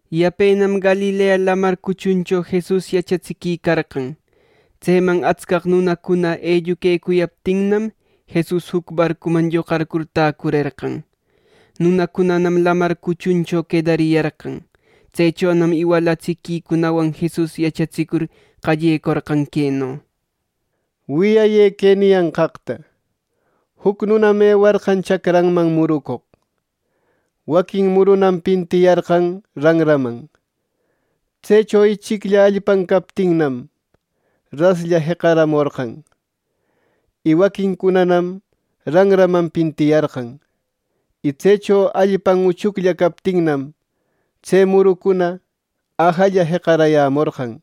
Yapenam Galilea Lamar cuchuncho Jesus yachatsiquicarqan. Tseman atscaq nunacuna elluquecuyaptinnam Jesusqa juc barcuman lloqarcur täcurerqan. Nunacunanam lamar cuchuncho quedariyarqan. Tsechonam iwalatsiquicunawan Jesus yachatsicur qallecorqan queno: “Wiyayë que niyanqaqta: Juc nunam ewarqan chacranman murucoq. Waquin murunam pintiyarqan ranraman. Tsecho ichiclla allpan captinnam, raslla jeqaramorqan. Y waquincunanam ranraman pintiyarqan. Y tsecho allpan uchuclla captinnam, tse murucuna ajalla jeqarayämorqan.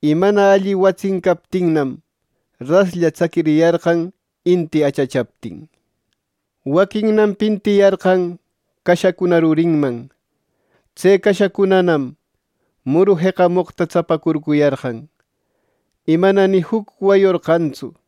Y mana alli watsin captinnam, raslla tsaquiriyarqan inti achachaptin. Waquinnam pintiyarqan cashacuna rurinman. Tse cashacunanam muru jeqamoqta tsapacurcuyarqan, y mana ni juc wayorqantsu.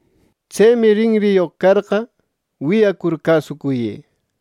“¡Tsemi rinriyoq carqa, wiyacur cäsucuyë!”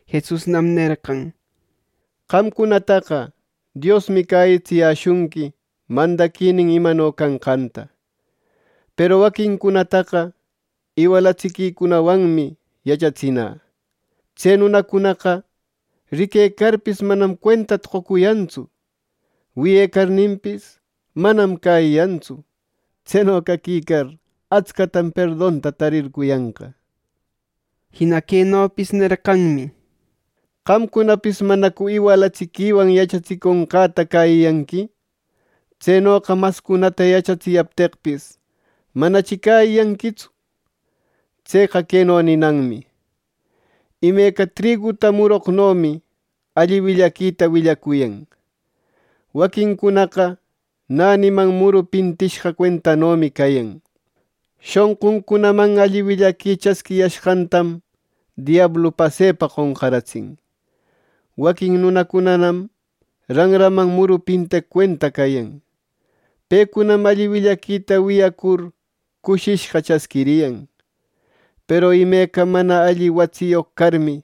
Jesusnam nerqan: —Qamcunataqa Diosmi cäyitsiyäshunqui mandaquinin imano canqanta. Peru waquincunataqa iwalatsiquicunawanmi yachatsinä. “Tse nunacunaqa riquecarpis, manam cuentata qocuyantsu. Wiyecarninpis, manam cäyiyantsu. Tseno caquicar atscatam perdonta tarircuyanqa.” Jina quenopis nerqanmi: ¿Qamcunapis manacu iwalatsiquiwan yachatsiconqäta cäyiyanqui? Tsenoqa mascunata yachatsiyapteqpis, manachi cäyiyanquitsu. Tseqa queno ninanmi: Imeca triguta muroqnomi alli willaquita willacuyan. Waquincunaqa näniman muru pintishqa cuentanomi cayan. Shonquncunaman alli willaqui chasquiyashqantam diablu pasepa qonqaratsin. Waquin nunacunanam ranraman muru pinteq cuenta cayan. Pecunam alli willaquita wiyacur cushishqa chasquiriyan. Peru imeca mana alli watsiyoq carmi,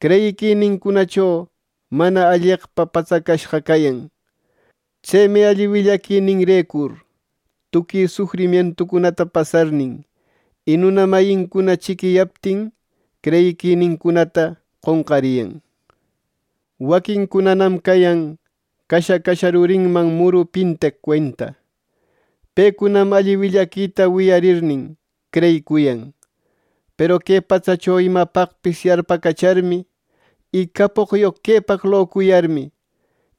creyiquinincunacho mana alleqpa patsacashqa cayan. Tsemi alli willaquininrecur tuqui sufrimientucunata pasarnin, y nuna mayincuna chiquiyaptin creyiquinincunata qonqariyan. Waquincunanam cayan casha, casha rurinman muru pinteq cuenta. Pecunam alli willaquita wiyarirnin creyicuyan; peru que patsacho imapaqpis yarpacacharmi, y capoqyoq quepaq locuyarmi,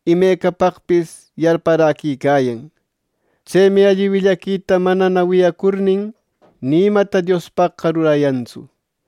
imecapaqpis yarparäquicayan. Tsemi alli willaquita manana wiyacurnin, ni imata Diospaqqa rurayantsu.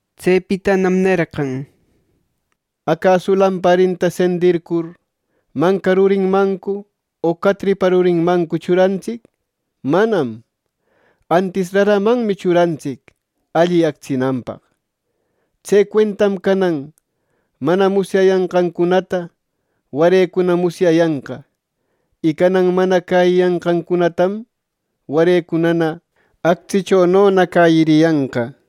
Tsepitanam nerqan, “¿Acasu lamparinta sendircur, manca rurinmancu o catripa rurinmancu churantsic? ¡Manam! Antis raramanmi churantsic alli actsinanpaq. Tse cuentam canan mana musyayanqancunata warecuna musyayanqa, y canan mana cäyiyanqancunatam, warecunana actsichonona cäyiriyanqa.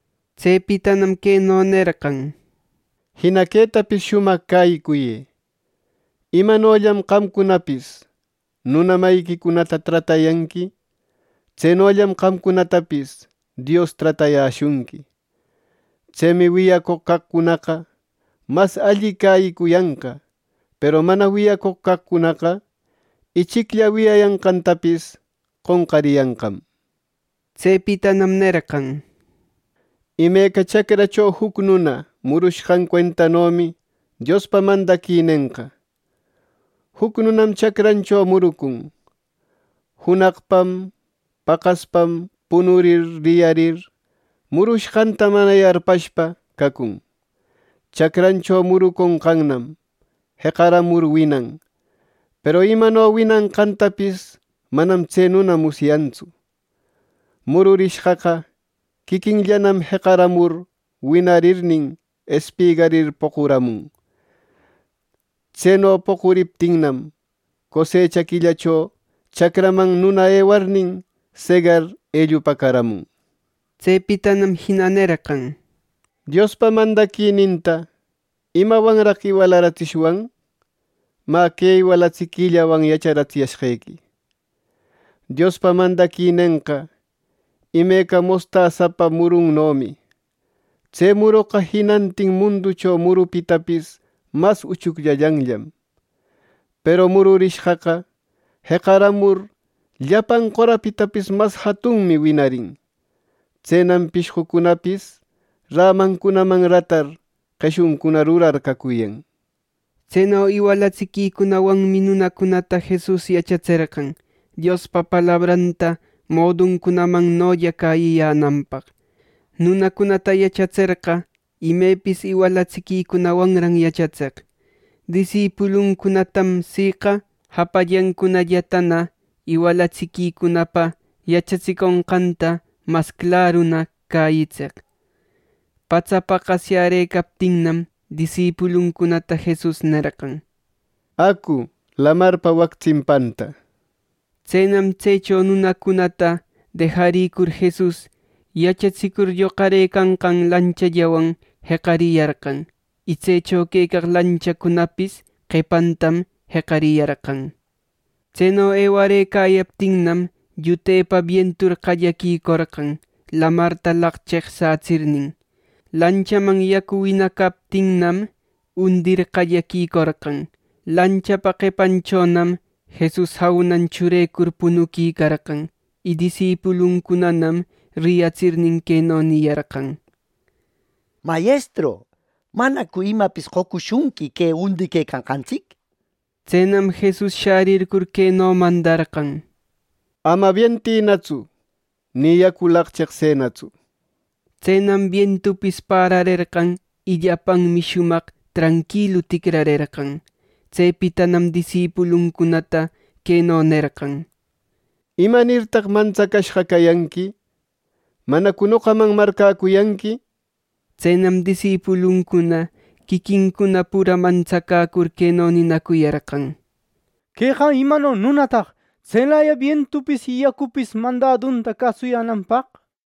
Tsepitanam queno nerqan: “Jina quetapis shumaq cäyicuyë: imanollam qamcunapis nuna mayiquicunata tratayanqui, tsenollam qamcunatapis Dios tratayäshunqui. Tsemi wiyacoq caqcunaqa mas alli cäyicuyanqa, peru mana wiyacoq caqcunaqa, ichiclla wiyayanqantapis qonqariyanqam” nir. Tsepitanam nerqan: —Imeca chacracho juc nuna murucushqan cuentanomi Diospa mandaquinenqa. Juc nunam chacrancho murucun junaqpam, paqaspam; punurir, riyarir murushqanta mana yarpashpa cacun. Chacrancho muronqannam jeqaramur winan. Peru imano winanqantapis manam tse nuna musyantsu. Mururishqaqa quiquinllanam jeqaramur winarirnin, espigarir poquramun. Tseno poquriptinnam, cosecha quillacho chacranman nuna ewarnin, segar ellupäcaramun. Tsepitanam jina nerqan: “Diospa mandaquininta ¿imawanraq iwalaratsishwan? Mä, que iwalatsiquillawan yacharatsiyashqequi: Diospa mandaquinenqa imeca mostasapa murunnomi. Tse muroqa jinantin munducho murupitapis mas uchucllallanllam. Peru mururishqaqa jeqaramur llapan qorapitapis mas jatunmi winarin. Tsenam pishqucunapis rämancunaman ratar qeshuncuna rurar cacuyan.” Tseno iwalatsiquicunawanmi nunacunata Jesus yachatserqan Diospa palabranta moduncunamannolla cäyiyänanpaq. Nunacunata yachatserqa, imepis iwalatsiquicunawanran yachatseq. Disipuluncunatam siqa japallancunallatana iwalatsiquicunapa yachatsiconqanta mas claruna cäyitseq. Patsa paqasyärëcaptinnam, disipuluncunata Jesus nerqan: —Acu lamarpa wac tsimpanta —nir. Tsenam tsecho nunacunata dejarïcur, Jesus yachatsicur lloqarëcanqan lanchallawan jeqariyarqan. Y tsecho quecaq lanchacunapis qepantam jeqariyarqan. Tseno ewarëcayaptinnam, llutepa bientur qallaquicorqan, lamarta laqcheqsätsirnin. Lanchaman yacu winacaptinnam, undir qallaquicorqan. Lanchapa qepanchonam Jesus jaunan churecur punuquicarqan. Y disipuluncunanam riyatsirnin, queno niyarqan: —¡Mayestru! ¿Manacu imapis qocushunqui que undiquecanqantsic! Tsenam Jesus shärircur, queno mandarqan: —Amana bientïnatsu; ni yacu laqcheqsënatsu. Tsenam bientupis pararerqan, y llapanmi shumaq tranquilu ticrarerqan. Tsepitanam disipuluncunata queno nerqan: —¿Imanirtaq mantsacashqa cayanqui? ¿Manacu noqaman marcäcuyanqui? Tsenam disipuluncuna quiquincuna pura mantsacäcur queno ninacuyarqan: —¿Queqa imano nunataq, tselaya bientupis y yacupis mandadunta cäsuyänanpaq!